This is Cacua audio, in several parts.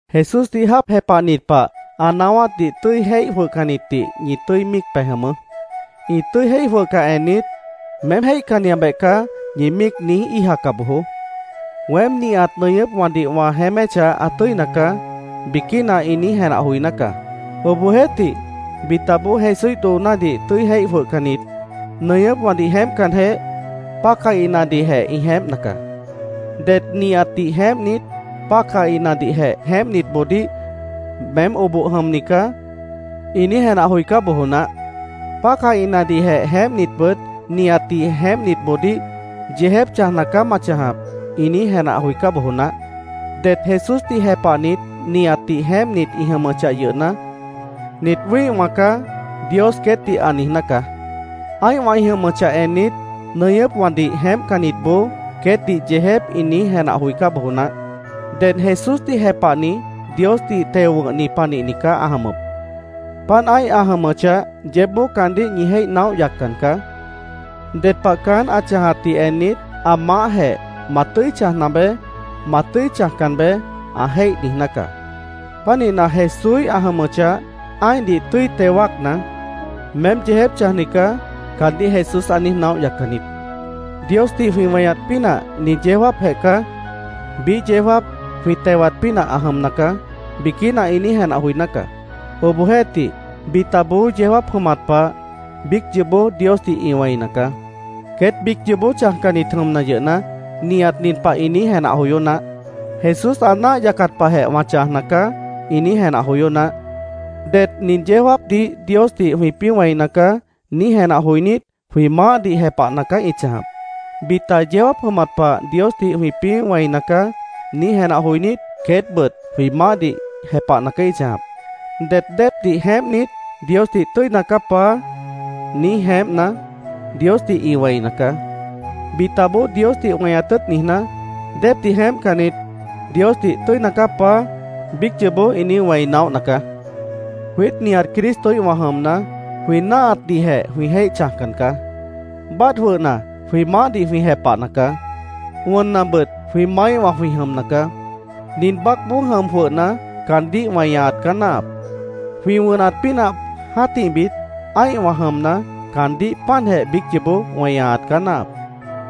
Jesúsdih jáap jepahnit pah, ã naáwátdih tʉ́i jéih jwʉhcannitdih ñi tʉ́i míic pej jʉmʉʉ́. Ĩ tʉ́i jéih jwʉhcah ennit, “Meém jéihcanniabeh caá”, ñi míic niíj íijaca bojoó. “Weém nihat nʉñʉ́pwãdih wã jeéméchah ã tʉ́ina caá”, biquína ĩ niíj jenah joiná caá. Obohjeéhtih, bitaboó, Jesúíh doonádih tʉ́i jéih jwʉhcannit, nʉñʉ́pwãdih jeémpcanjeh, pácahinadihjeh ĩ jeémpna caá. Det nihatdih jeémpnit, pácahinadihjeh jeémpnitboodíh “Meém oboh jʉmni caá”, ĩ niíj jenah joicá bojo naáh. Pácahinadihjeh jeémpnitbʉt nihatdih jeémpnitboodíh “Yeejép chãjna caá ma chãjap”, ĩ niíj jenah joicá bojo naáh. Det Jesúsdih jepahnit nihatdih jeémpnit ĩ jʉmʉchah yʉhna, “Nit wĩ́ihwã caá”, Dios queétdih ã niijná caá. Ã́ihwã ĩ jʉmʉchah ennit, nʉñʉ́pwãdih jeémpcannitboó queétdih yeejép ĩ niíj jenah joicá bojo naáh. Ded Jesúsdih jepahni Diosdih teo wʉ̃hni panihni caá ã jʉmʉp. Páant ã́ih ã jʉmʉchah, yeébboó caandíh ñi jéih naóh yaccan caá. Ded pah caán ã chãjatdih ennit, ã maáhjeh “Ma tʉ́i chãjna beé. Ma tʉ́i chãjcan beé”, ã jéih niijná caá. Pánihna, Jesúíh ã jʉmʉchah, ã́ihdih tʉ́i teo wáacna, “Meém yeejép chãjni caá”, caandíh Jesús ã niíj naóh yaccan niít. “Diosdih jwĩ weñat pínah nin yeó jáapjeh caá. Biíh yeó jáap jwĩ tewat pínah ã jʉmna caá”, biquína ĩ niíj jenah joiná caá. Obohjeéhtih, bitaboó yeó jáap jʉmat pah biíc yoobó Diosdih ĩ wẽina caá. Queét biíc yoobó chãjcannit jʉmna yʉhna, nihat nin pah ĩ niíj jenah joyó naáh: “Jesús ã náah yacat pahjeh wã chãjna caá”, ĩ niíj jenah joyó naáh. Det “Nin yeó jáapdih Diosdih jwĩpĩ́ wẽina caá”, niíj jenah joinít, jwĩ maáhdih jepahna caá ĩ chãjap. Bita “Yeó jáap jʉmat pah Diosdih jwĩpĩ́ wẽina caá”, niíj jenah joinít, queétbʉt jwĩ maáhdih jepahna caá ĩ chãjap. Det déepdih jeémpnit, Diosdih “Tʉ́ina caá, Paá”, niíj jeémpna, Diosdih ĩ wẽina caá. Bitaboó Diosdih weñat tʉ́ʉt niijná, déepdih jeémpcannit, Diosdih “Tʉ́ina caá, Paá”, biíc yoobó ĩ niíj wẽi naóhna caá. Jwiít nihat Cristoíhwã jʉmna, jwĩ náahatdihjeh jwĩ jéih chãjcan caá. Báadh jwʉhna, jwĩ maáhdih jwĩ jepahna caá. Wʉnnabʉt jwĩ maáíhwã jwĩ jʉmna caá. Nin baácboó jʉm jwʉhna, caandíh weñaat caá náahap. Jwĩ wʉnat pínah jã́tihbit, ã́ihwã jʉmna, caandíh páantjeh biíc yoobó weñaat caá náahap.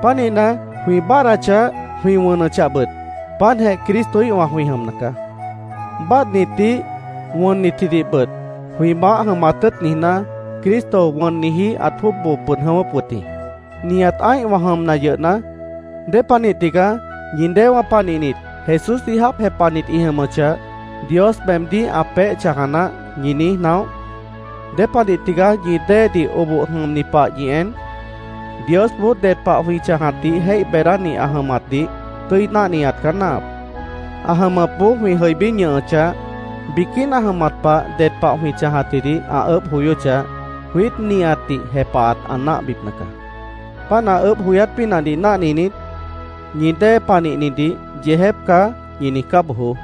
Pánihna, jwĩ báadhdachah, jwĩ wʉnʉchahbʉt, páantjeh Cristoíhwã jwĩ jʉmna caá. Báadhnitdih, wʉnnitjidihbʉt, jwĩ Maáh jʉmat tʉ́ʉt niijná, Cristo wʉnniji ãt jwʉ́ʉb boo pʉd jʉ̃ʉ́wʉ́p wʉt jĩ. Nihat ã́ihwã jʉmna yʉhna, ¿Dépanih tigaá ñi déewã panihnit Jesúsdih jáap jepahnit ĩ jʉmʉchah, “Dios meemdíh ã peéh chãja naáh”, ñi niíj naóh? ¿Dépanih tigaá ñi déedih oboh jʉmni pah ñi en? Diosboó ded pah jwĩ chãjatdih jéih beedáni ã jʉmatdih tʉ́i náhniat caá náahap. Ã jʉmʉpboó jwĩ jʉibí ñʉhʉchah, biquína jʉmat pah ded pah jwĩ chãjatjidih ã ʉʉ́bh joyóchah, jwiít nihatdih jepahat ã náahbipna caá. Páant ã ʉʉ́bh joyát pínahdih náhninit, ñi dée panihnidih “Yeejép caá”, ñi niijcá bojoó.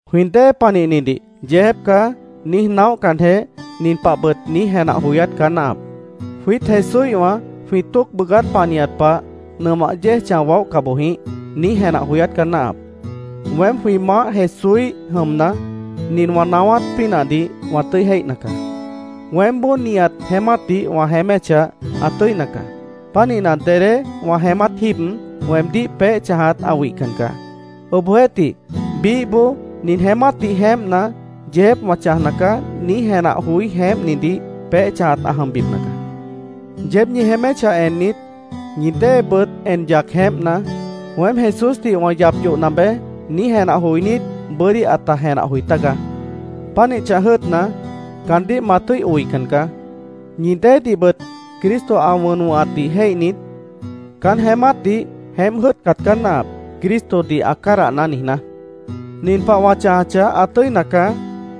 Jwĩ dée panihnidih “Yeejép caá”, niíj naóhcanjeh, nin pahbʉt niíj jenah joyát caá náahap: “Jwiít Jesúíhwã jwĩ tóoc bʉʉgát panihat pah, nʉmah yéej chãj waóhca boj jĩíh”, niíj jenah joyát caá náahap. Weém jwĩ Maáh Jesúíh jʉmna, nin wã naáwát pínahdih wã tʉ́i jéihna caá: Weémboó nihat jeémátdih wã jeéméchah, ã tʉ́ina caá. Pánihna, dedé wã jeémát jíib, weemdíh peéh chãjat ã wihcan caá. Obohjeéhtih, biíhboó “Nin jeémátdih jeémpna, yeejép wã chãjna caá”, niíj jenah joí jeémpnidih peéh chãjat ã jʉmbipna caá. Yeéb ñi jeéméchah ennit, ñi déebʉt en yac jeémpna, “Weém Jesúsdih wã yap yohna beé”, niíj jenah joinít, bʉ́dí ãta jenah joi tágaá. Pánih chãj jʉ́ʉtna, caandíh ma tʉ́i oican caá. Ñi déedihbʉt Cristo ã wʉn wʉ̃hatdih jéihnit, caán jeémátdih jeémp jʉ́ʉtcat caá náahap, “Cristodih ã cádahná”, niijná. “Nin pah wã chãjachah, ã tʉ́ina caá”,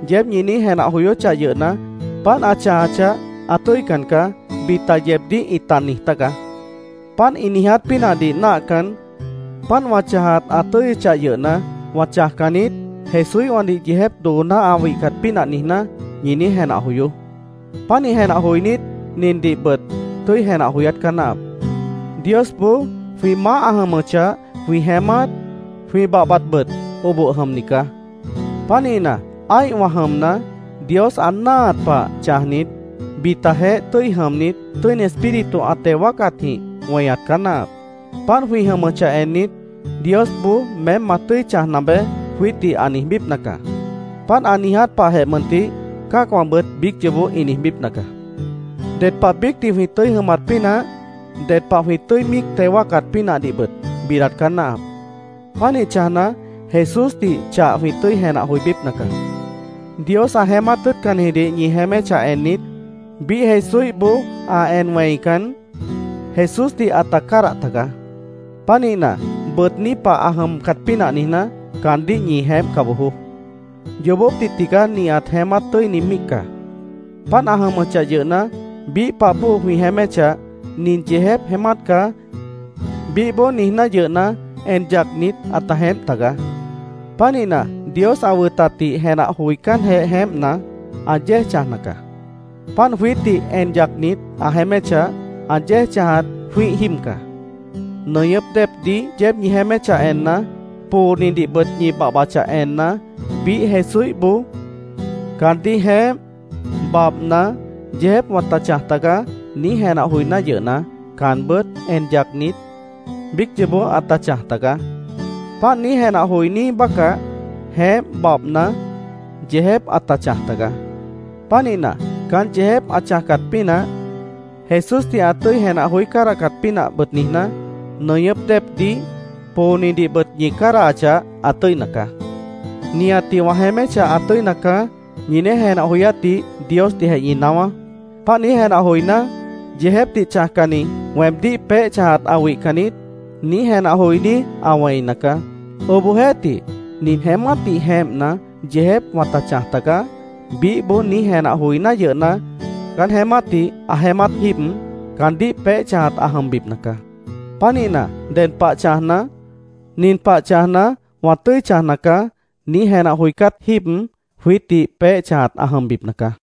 yeéb ñi niíj jenah joyóchah yʉhna, “Páant ã chãjachah, ã tʉ́ican caá”, bita yeebdíh ĩta niij tágaá. Páant ĩ niiját pínahdih náahcan, “Páant wã chãjat ã tʉ́yʉchah yʉhna, wã chãjcan niít, Jesúíhwãdih yeejép dooná ã wihcat pínah niijná”, ñi niíj jenah joyoó. Pánih jenah joinít, nindihbʉt tʉ́i jenah joyát caá náahap: Diosboó jwĩ maáh ã jʉmʉchah, jwĩ jeémát, jwĩ babhbatbʉt oboh jʉmni caá. Pánihna, ã́ihwã jʉmna, Dios ã náahat pah chãjnit, bitajeéh tʉ́i jʉmnit, Tʉ́ini Espíritu ã teo wáacatjĩh weñat caá náahap. Páant jwĩ jʉmʉchah ennit, Diosboó “Meém ma tʉ́i chãjna beé”, jwiítdih ã niijbípna caá. Páant ã niiját pahjeh mʉntih cã́acwãbʉt biíc yoobó ĩ niijbípna caá. Ded pah biícdih jwĩ tʉ́i jʉmat pínah, ded pah jwĩ tʉ́i míic teo wáacat pínahdihbʉt bidat caá náahap. Pánih chãjna, Jesúsdih chah jwĩ tʉ́i jenah joibípna caá. Dios ã jeémát tʉ́ʉtcannijidih ñi jeéméchah ennit, biíh Jesúíhboó ã en wẽican, Jesúsdih ãta cádah tagaá. Pánihna, bʉʉgní pah ã jʉmcat pínah niijná, caandíh ñi jeémpca bojoó. Yoobópdih tigaá nihat jeémát tʉ́ini míic caá. Páant ã jʉmʉchah yʉhna, biíh pah bóo jwĩ jeéméchah, “Nin yeejép jeémát caá”, biíhboó niijná yʉhna, en yacnit, ãta jeémp tagaá. Pánihna, Dios ã wʉtatdih jenah joicánjeh jeémpna, ã yéej chãjna caá. Páant jwiítdih en yacnit ã jeéméchah, ã yéej chãjat jwĩ́ih jíib caá. Nʉñʉ́p déepdih yeéb ñi jeéméchah enna, poonidihbʉt ñi babhbachah enna, biíh Jesúíhboó “Caandíh jeémp, babhna, yeejép wãta chãj tagaá”, niíj jenah joiná yʉhna, caanbʉ́t en yacnit, biíc yoobó ãta chãj tagaá. Páant niíj jenah joiní bácah, jeémp babhna, yeejép ãta chãj tagaá. Pánihna, caán yeejép ã chãjcat pínah, Jesúsdih ã tʉ́i jenah joí cádahcat pínahbʉt niijná, nʉñʉ́p déepdih, poonidihbʉt ñi cádahachah, ã tʉ́ina caá. “Nihatdih wã jeéméchah ã tʉ́ina caá”, ñi niíj jenah joyátdih Diosdihjeh ñi naáwá. Páant niíj jenah joiná, yeejépdih chãjcanni, “Weemdíh peéh chãjat ã wihcan niít”, niíj jenah joiní ã wẽina caá. Obohjeéhtih, “Nin jeémátdih jeémpna, yeejép wãta chãj tagaá”, biíhboó niíj jenah joiná yʉhna, caán jeémátdih ã jeémát jíib, caandíh peéh chãjat ã jʉmbipna caá. Pánihna, ded pah chãjna, “Nin pah chãjna, wã tʉ́i chãjna caá”, niíj jenah joicát jíib, jwiítdih peéh chãjat ã jʉmbipna caá.